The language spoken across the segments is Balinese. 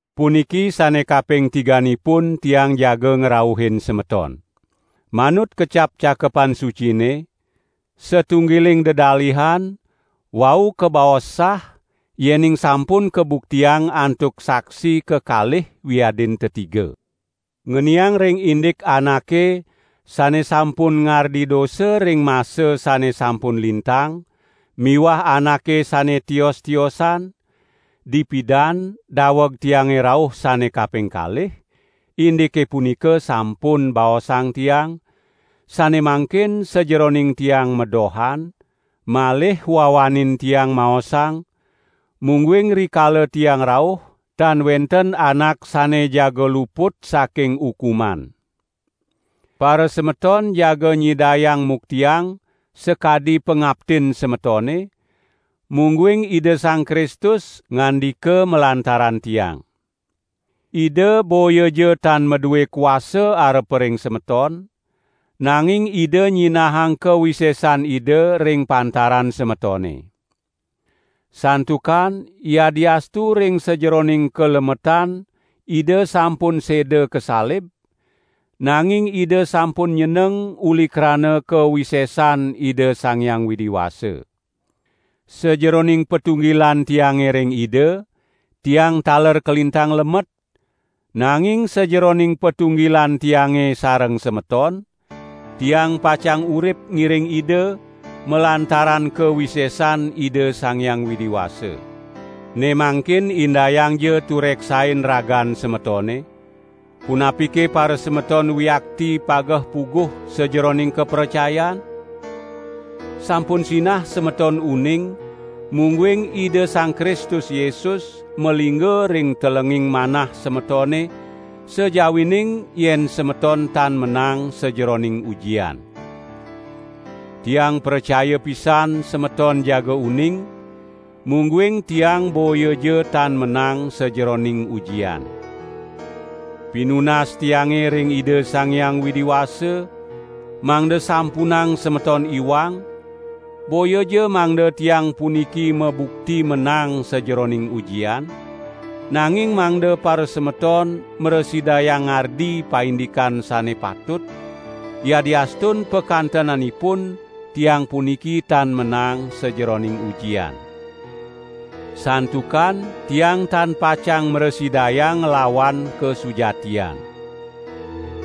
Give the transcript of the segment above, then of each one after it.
Puniki sane kaping tiganipun tiang jaga ngrauhin semeton. Manut kecap Cakepan Sucine: "Satunggiling dedalihan, wau kabaos sah yening sampun kabuktiang antuk saksi kekalih wiadin tetiga." Ngeniang ring indik anake sane sampun ngardi dosa ring masa sane sampun lintang miwah anake sane tios-tiosan, dipidan daweg tiange rauh sane kaping kalih, indike punika sampun baosang tiang, sane mangkin sajeroning tiang madohan, malih wawanin tiang maosang, mungguing rikala tiang rauh, tan wenten anak sane jaga luput saking ukuman. Parasemeton jaga nyidayang muktiang sakadi pangaptin semetone, mungguing Ida Sang Kristus ngandika malantaran tiang. Ida boyaja tan madue kuasa arepa ring semeton, nanging Ida nyinahang kawisesan Ida ring pantaran semetone. Santukan yadiastu ring sajeroning kalemetan Ida sampun seda kasalib, nanging Ida sampun nyeneng uli krana kawisesan Ida Sang Hyang Widi Wasa. Sajeroning patunggilan tiange ring Ida, tiang taler kalintang lemet, nanging sajeroning patunggilan tiange sareng semeton, tiang pacang urip ngiring Ida, malantaran kawisesan Ida Sang Hyang Widi Wasa. Ne mangkin indayangja tureksain ragan semetone, punapike parasemeton wiakti pageh-puguh sajeroning kapracayan? Sampun sinah semeton uning mungguing Ida Sang Kristus Yesus malingga ring telenging manah semetone sajawining yen semeton tan menang sajeroning ujian. Tiang pracaya pisan semeton jaga uning, mungguing tiang boyaja tan menang sajeroning ujian. Pinunas tiange ring Ida Sang Hyang Widi Wasa, mangda sampunang semeton iwang, boyaja mangda tiang puniki mabukti menang sajeroning ujian, nanging mangda parasemeton mrasidayang ngardi paindikan sane patut, yadiastun pakantenanipun tiang puniki tan menang sajeroning ujian. Santukan tiang tan pacang mrasidayang nglawan kasujatian.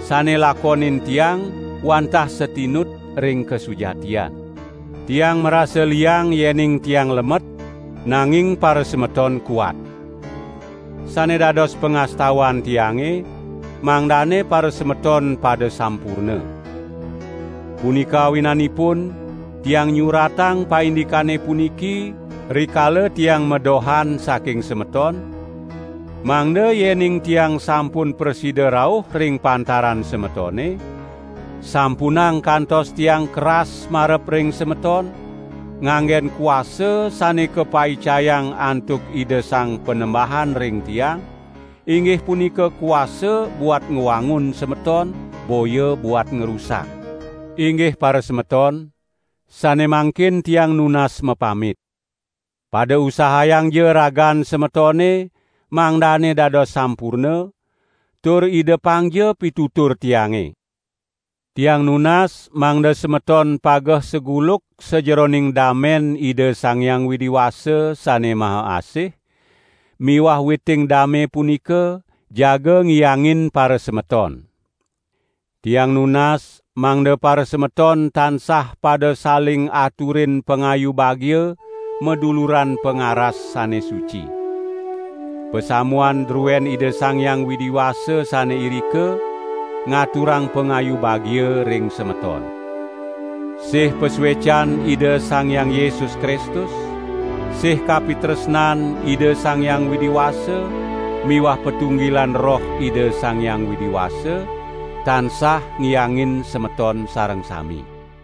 Sane lakonin tiang wantah satinut ring kasujatian. Tiang marasa liang yening tiang lemet, nanging parasemeton kuat. Sane dados pangastawan tiange, mangdane parasemeton pada sampurna. Punika awinanipun tiang nyuratang paindikane puniki rikala tiang madohan saking semeton, mangda yening tiang sampun prasida rauh ring pantaran semetone, sampunang kantos tiang keras marep ring semeton, nganggen kuasa sane kapaicayang antuk Ida Sang Panembahan ring tiang, inggih punika kuasa buat ngwangun semeton boya buat ngrusak. Inggih parasemeton, sane mangkin tiang nunas mapamit! Pada usahayangja ragan semetone mangdane dados sampurna, tur idepangja pitutur tiange! Tiang nunas mangda semeton pageh saguluk sajeroning dame Ida Sang Hyang Widi Wasa Sane Maha Asih, miwah witing dame punika, jaga ngiyangin parasemeton! Tiang nunas mangda parasemeton tansah pada saling aturin pangayu bagia maduluran pangaras sane suci. Pasamuan druen Ida Sang Hyang Widi Wasa sane irika, ngaturang pangayu bagia ring semeton. Sih pasuecan Ida Sang Hyang Yesus Kristus, sih kapitresnan Ida Sang Hyang Widi Wasa miwah patunggilan Roh Ida Sang Hyang Widi Wasa, tansah ngiangin semeton sareng sami.